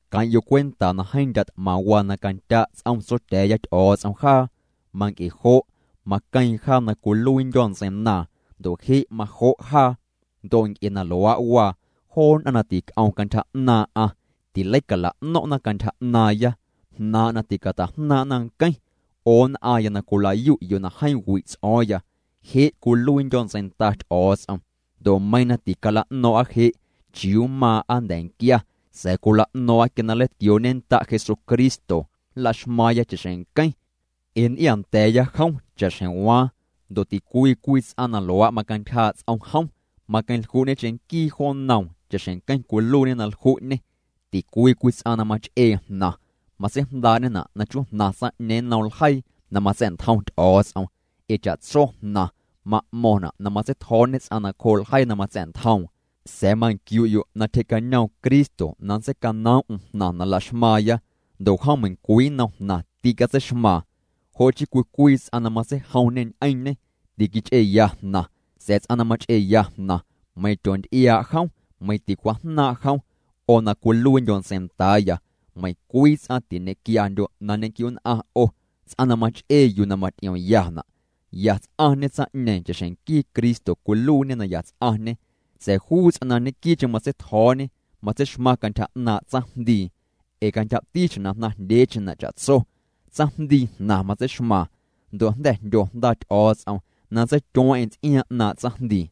Queⁿ'yo' cwenta na jeeⁿ ndya' t'maⁿ waa na candya' ts'om Tsotya̱a̱ya Ty'o̱o̱ts'om jaa. Manc'e jo' maqueeⁿ jaa na cwiluiindyo̱ ntseinaaⁿ, ndo' je' majo' jaa. Ndo' nc'e na luaa' waa joo nn'aⁿ na tic'om cantyja 'naaⁿ'aⁿ tileicala'no̱ⁿ'na cantyja 'naaⁿya, jnaaⁿ' na ticata'jnaaⁿ'na nqueⁿ. 'O nn'aⁿya na cwila'yu'yo' na jeeⁿ wi' ts'o̱o̱ⁿya, je' cwiluiindyo̱ ntseinda Ty'o̱o̱ts'om. Ndo' meiiⁿ na ticala'no̱o̱ⁿ'a je' chiuu mmaaⁿ'a nnda̱nquia sa̱a̱ cwila'no̱o̱ⁿ'a quia na nleitquioo'ñennda' Jesucristo, nlaxmaaⁿya cha'xjeⁿ nqueⁿ, ee nnty'iaa nda̱a̱ya jom cha'xjeⁿ waaⁿ. Ndo' ticwii cwii ts'aⁿ na luaa' macantyjaa' ts'om jom, maqueⁿlju'ñe cheⁿnquii jo nnoom cha'xjeⁿ nqueⁿ cwiluiiñê na lju'ñê. Ticwii cwii ts'aⁿ na mach'ee jnaⁿ, matseijndaa'ñena' na chujnaⁿ tsaⁿ'ñeeⁿ nnom ljeii na matsa̱'ntjom Ty'o̱o̱ts'om, ee cha'tso jnaⁿ ma'mo̱ⁿna' na matseitjo̱o̱ñe ts'aⁿ nacjoo' ljeii na matsa̱'ntjoom. Sa̱a̱ manquiu'ya'yo' na tyjee'cañoom Cristo na nntseicanoom'm jnaⁿ na laxmaaⁿya. Ndo' jom meiⁿcwii nnom jnaⁿ tîcatseixmaaⁿ. Jo' chii cwii cwii ts'aⁿ na matseijomñe ñ'eⁿñê, tiquich'eeya jnaⁿ, sa̱a̱ ts'aⁿ na mach'eeya jnaⁿ, meiⁿ tyoonty'iaa' jom, meiⁿ ticwajnaaⁿ' jom. 'O na cwiluiindyo' ntseindaaya, meiⁿcwii ts'aⁿ tiñenquiandyo' na nñequiu'nn'aⁿ 'o, ts'aⁿ na mach'ee yuu na maty'iomyana', ya ts'aⁿñe cha'xjeⁿ nquii Cristo cwiluiiñê na ya ts'aⁿñê. Sa̱a̱ juu ts'aⁿ na ñequii'cheⁿ matseitjo̱o̱ñe, matseixmaⁿ cantyja 'naaⁿ' tsaⁿjndii. Ee cantyjati xjeⁿ na jnaⁿjndyeecheⁿna' cha'tso, tsaⁿjndii jnaⁿ matseixmaaⁿ. Ndo' jnda̱ jndyo Jnda Ty'o̱o̱ts'om na nntseityueeⁿ'eⁿ ts'iaaⁿ 'naaⁿ' tsaⁿjndii.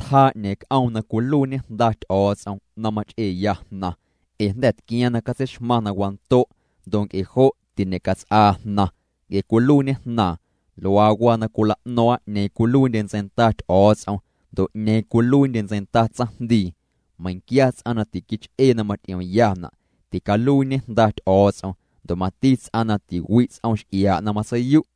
Tjaa 'ñeeⁿ c'oom na cwiluiiñe jnda Ty'o̱o̱ts'om na mach'eeya jnaⁿ ee jnda̱ tquiaaⁿ na catseixmaⁿ na wando' ndo' nc'e jo' tiñecats'aa jnaⁿ nc'e cwiluiiñe jnaaⁿ. Luaa waa na cwila'no̱o̱ⁿ'a 'ñeeⁿ cwiluiindye ntseinda Ty'o̱o̱ts'om ndo' 'ñeeⁿ cwiluiindye ntseinda tsaⁿjndii, meiⁿ quia ts'aⁿ na tiquich'ee na maty'iomyana' ticaluiiñe jnda Ty'o̱o̱ts'om ndo' mati ts'aⁿ na tiwi' ts'om x'iaa' na matseiyu'.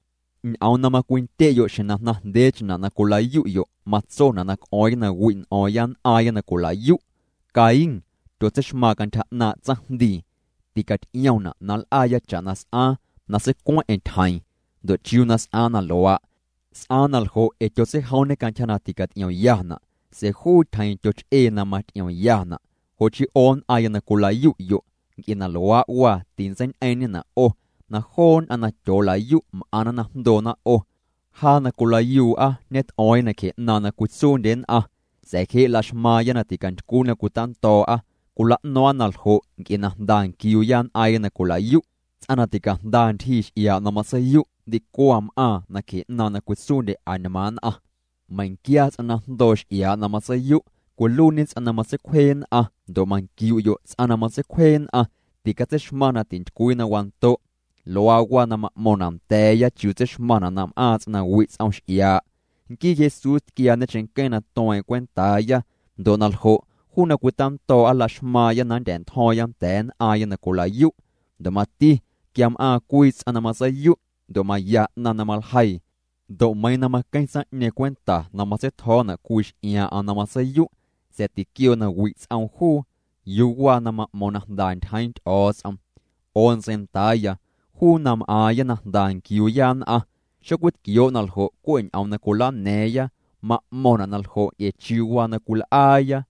Ñ'oom na macwindye'yo' xjeⁿ na jnaⁿjndyeecheⁿna' na cwila'yu'yo' matsona' na c'o̱o̱ⁿya na wi' n'o̱o̱ⁿya nn'aaⁿya na cwila'yu'. Caín tyotseixmaaⁿ cantyja 'naaⁿ' tsaⁿjndii. Ticaty'iomna' na nl'aaya cha'na s'aaⁿ na seicueⁿ'eⁿ tyjeeⁿ. Ndo' ¿chiuu na s'aaⁿ na luaa'? S'aaⁿ na ljo' ee tyotseijomñê cantyja na ticaty'iomyana', sa̱a̱ juu tyjeeⁿ tyoch'ee na maty'iomyana'. Jo' chii 'o nn'aⁿya na cwila'yu'yo', nc'e na luaa' waa tintseiñ'eeⁿ'ñena' 'o na joo nn'aⁿ na tyoola'yu' m'aⁿna na jndoona 'o. Jaa na cwilayuu'a ñet'o̱o̱ⁿya nacje 'naaⁿ' na cwitsuundye nn'aⁿ sa̱a̱ je' laxmaaⁿya na ticantycwii na cwitando̱o̱'a. Cwila'no̱o̱ⁿ'a na ljo' nc'e na jnda nquiuuya nn'aaⁿya na cwilayu'. Ts'aⁿ na ticajnda ntyjii x'iaa' na matseiyu', ndicwaⁿ m'aaⁿ nacje 'naaⁿ' na cwitsuundye añmaaⁿ nn'aⁿ. Meiⁿquia ts'aⁿ na jndoo' x'iaa' na matseiyu' cwiluiiñe ts'aⁿ na matseicwjee nn'aⁿ ndo' manquiu'yo' ts'aⁿ na matseicwjee nn'aⁿ ticatseixmaⁿ na tintycwii na wando'. Luaa waa na ma'mo̱ⁿna' nda̱a̱ya chiuu tseixmaⁿna' na m'aaⁿ ts'aⁿ na wi' ts'om x'iaa'. Nquii Jesús tquiaañe cheⁿnqueⁿ na tueeⁿ'eⁿ cwentaaya. Ndo' na ljo', juu na cwitando̱o̱'a laxmaaⁿya na nndya̱'ntjo̱o̱ⁿya nda̱a̱ nn'aaⁿya na cwilayu'. Ndo' mati quia m'aaⁿ cwii ts'aⁿ na matseiyu' ndo' maya 'naⁿ na maljeii, ndo' meiiⁿ na maqueⁿ tsaⁿ'ñeeⁿ cwenta na matseitjo̱o̱na' cwii x'iaaⁿ'aⁿ na matseiyu', sa̱a̱ tiquioo na wi' ts'oom juu, ¿yuu waa na ma'mo̱o̱ⁿ na jnda ntyjeeⁿ Ty'o̱o̱ts'om? 'O ntseindaaya, juu na m'aaⁿya na jnda nquiuuya nn'aⁿ, xocwitquioo' na ljo' cwe' ñ'oom na cwilana̱a̱ⁿya, ma'mo̱ⁿna' na ljo' nc'e chiuu na cwil'aaya.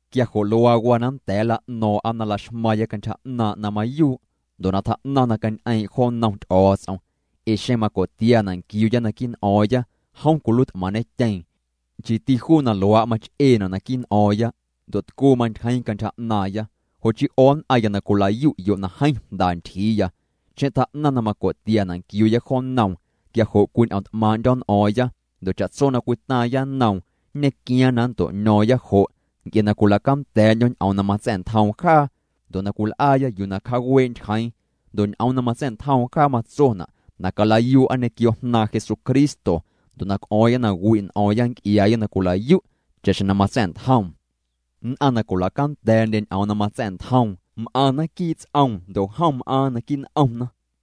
Quia jo' luaa waa na nnda̱a̱ nla'no̱o̱ⁿ'a na laxmaaⁿya cantyja 'naaⁿ' na mayuu' ndo' na tjaa'naⁿ na cañ'eeⁿ' jo nnom Ty'o̱o̱ts'om, ee xeⁿ maco'tiana' nquiuuya naquii' n'o̱o̱ⁿya, jom cwiluiit'maⁿñetyeeⁿ, nchiiti juu na luaa' mach'eena' naquii' n'o̱o̱ⁿya ndo' tcuu mantyjeeⁿ cantyja 'naaⁿya. Jo' chii 'o nn'aⁿya na cwila'yu'yo' na jeeⁿ jnda ntyjiiya, xeⁿ tjaa'naⁿ na maco'tiana' nquiuuya jo nnoom, quia jo' cwiñ'o̱ⁿt'maaⁿ'ndyo̱ n'o̱o̱ⁿya, ndo' cha'tso na cwitaaⁿya nnoom, nñequiaaⁿ na nnto'ño̱o̱ⁿya jo' nc'e na cwila'canda̱a̱'ndyo̱ ñ'oom na matsa̱'ntjoom jaa ndo' na cwil'aaya yuu na cjaawee' ntyjeeⁿ. Ndo' ñ'oom na matsa̱'ntjoom jaa matsona' na calayuu'a ñequio Jnaaⁿ Jesucristo ndo' na c'o̱o̱ⁿya na wi' n'o̱o̱ⁿya nc'iaaya na cwilayu' cha'xjeⁿ na matsa̱'ntjoom. Nn'aⁿ na cwila'canda̱a̱'ndye ñ'oom na matsa̱'ntjoom, m'aⁿna quii' ts'oom ndo' jom m'aaⁿ naquii' n'omna.